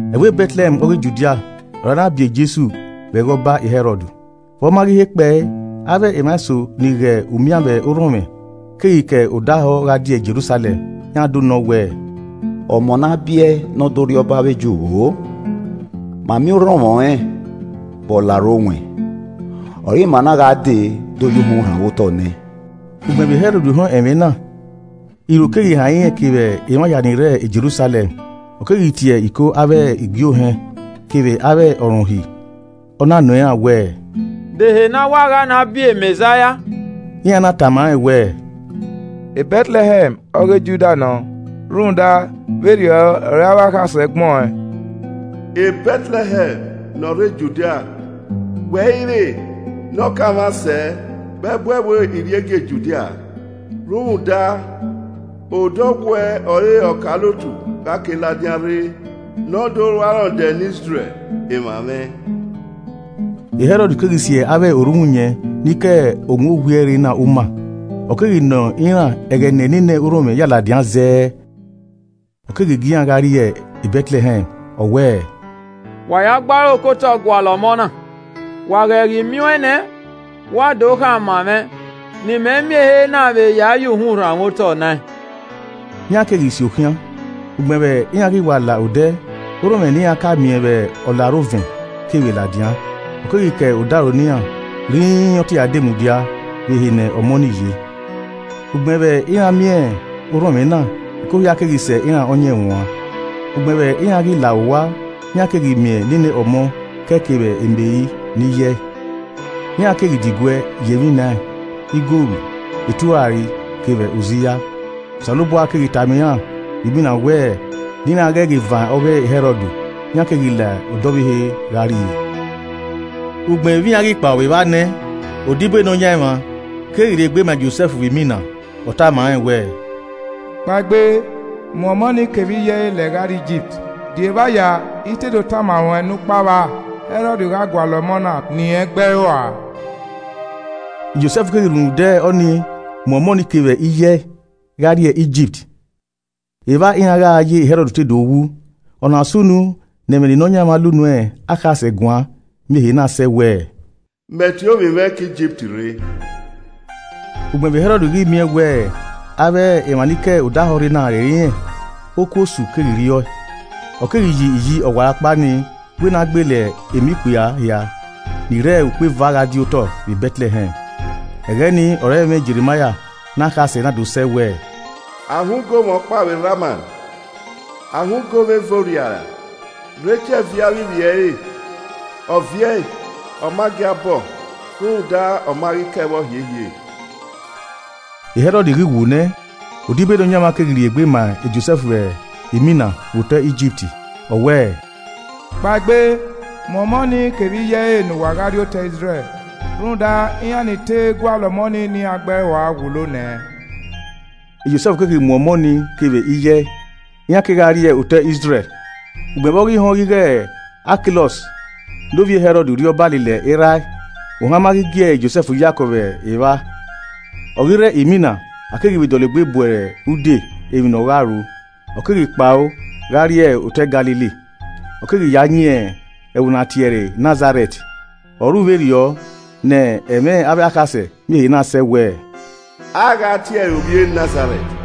Ẹvbo Bẹtlẹhẹm ọghe Judia ọre a na biẹ Jesu vbe ẹghẹ ọba Hẹrọd. Vbe ọ ma ghi he kpẹe, avbe emwa eso ni ghe umian vbe orhọnmwẹ, keghi ke odẹ ahọ gha die Jerusalẹm. Iran do nọọn wẹẹ, “Ọmọ ne a biẹ ẹe ne ọ do rriọba avbe Ju vbo? Ma miẹn orhọnmwẹ ọnrẹn vbe ọlarre owẹn, ọre ima na gha de do ye uhunmwu rhanmwẹ otọ nẹẹn.” Ugbẹn vbe Hẹrọd họn ẹmwẹ na, iro keghi han irẹn kevbe emwa hia ni rre Jerusalẹm. Ọ keghi tie iko avbe igie ohẹn kevbe avbe ọ rẹn Uhi, ọ na nọ iran wẹẹ, “De ehe ne a wẹ a gha na biẹ Mẹzaia?” Iran na tama rẹn wẹẹ, “Bẹtlẹhẹm ọghe Judia nọ. Rhunmwuda, vberriọ ọ re avbe akhasẹ gbẹn ọẹn: “ ‘Bẹtlẹhẹm ne ọ rre Judia, wẹ i re ne ọ kanmwa sẹ, vbe ẹbu ẹvbo iriegie Judia Rhunmwuda, odọ ọwuẹ ọre ọkaolotu gha ke ladian rre ne ọ do ru arọndẹ ne Izrẹl, emwa mwẹ.’” Hẹrọd keghi si avbe orhunmwuyẹn ni ke owẹn owiẹ rre na uma, ọ keghi nọ iran ẹghẹ ne nene orhọnmwẹ ya ladian zẹẹ. Ọ keghi gie iran gha rrie Bẹtlẹhẹm ọ wẹẹ, “Wa ya gbe aro kotọ gualọ ọmọ na, wa ghẹ ghi miẹn ọẹn nẹ, wa do khama mwẹ ne imẹ miẹn ehe na vbe ya ya uhunmwu rhanmwẹ otọ nẹẹn.” Iran keghi si okhian. Ugbẹn vbe iran ghi wa la odẹ, orhọnmwẹ ne iran ka miẹn vbe ọlarre ovẹn, kevbe ladian, ọ keghi ke odaro ne iran rhinrin ọ te ya demudia vbe ehe ne ọmọ ni ye. Ugbẹn vbe iran miẹn orhọnmwẹ na, ẹko hia keghi sẹ iran ọyẹnmwẹ uan. Ugbẹn vbe iran ghi la owa, iran keghi miẹn nene ọmọ kẹe kevbe Meri ne iye ẹe. Iran keghi diguẹ ya emwi nẹẹn, igoru, eturari kevbe oziya. Osanobua keghi tama iran vbe imina wẹ ne iran ghẹ ghi van ọghe Hẹrọd, iran keghi la odẹ ọvbehe gha rrie. Ugbẹn vbe iran ghi kpao vbe evba nẹ, odibo e Nọyaẹnmwa keghi rhiegbe ma e Josẹf vbe imina, ọ tama rẹn wẹẹ, “Kpaegbe, mu ọmọ ni kevbe iye ẹe lẹ gha rrie Igipt, di evba ya I te do tama ruẹn ne ukpa vba. Hẹrọd gha gualọ ọmọ na ne irẹn gbe ẹe rua.” Josẹf keghi rhunmwuda ọnii mu ọmọ ni kevbe iye ẹe gha rrie Igipt. Evba iran gha ye Hẹrọd to do wu. Ọna sunu ne ẹmwẹ ne Nọyaẹnmwa la unu akhasẹ guan miẹn ehe na sẹ wẹẹ, “Mẹ tie ovbi mwẹ ke Igipt rre.” Ugbẹn vbe Hẹrọd ghi miẹn wẹ avbe emwa ni ke odẹ ahọ rre na rẹrẹ irẹn, okuosu keghi rriọe, ọ keghi yi iyi ọwarọkpa nii wẹ ne a gbele emọ ikpia hia ni rre ukpo eva gha di otọ vbe Bẹtlẹhẹm. Ẹghẹ nii ọre ẹmwẹ Jerimaia ne akhasẹ na do sẹ wẹẹ, “A họn ugomwẹ ọkpa vbe Rama, a họn ugomwẹ eve orriara, Rekiẹl viẹ avbe ivbi ẹre; ọ viẹ ẹe, ọ ma gia bọ ọ, rhunmwuda, ọ ma ghi kẹe vbọ hiehie.” E Hẹrọd ghi wu nẹ, odibo e Nọyaẹnmwa keghi rhiegbe ma Josẹf vbe imina vbe otọ Igipt. Ọ wẹẹ, “Kpaegbe, mu ọmọ ni kevbe iye ẹe ne uwa gha rrie otọe Izrẹl rhunmwuda iran ni te gualọ ọmọ ni ne iran gbe ẹe rua wulo nẹ.” E Josẹf keghi mu ọmọ ni kevbe iye ẹe, iran kegha rrie otọe Izrẹl. Ugbẹn vbe ọ ghi họn ighẹ, Akilọs ne ovbi e Hẹrọd rriọba lele erha ẹe, ohan ma ghi gie Josẹf yakọ vbe evba. Ọ ghi rre imina, a keghi vbe dọlegbe bu ẹre ude emwi ne ọ gha ru. Ọ keghi kpao gha rrie otọe e Galili. Ọ keghi ya yin ẹvbo ne a tie ẹre Nazarẹt. Ọ ru vberriọ ne ẹmwẹ avbe akhasẹ miẹn ehe na sẹ wẹẹ, “A gha tie ẹre ovbi e Nazarẹt.”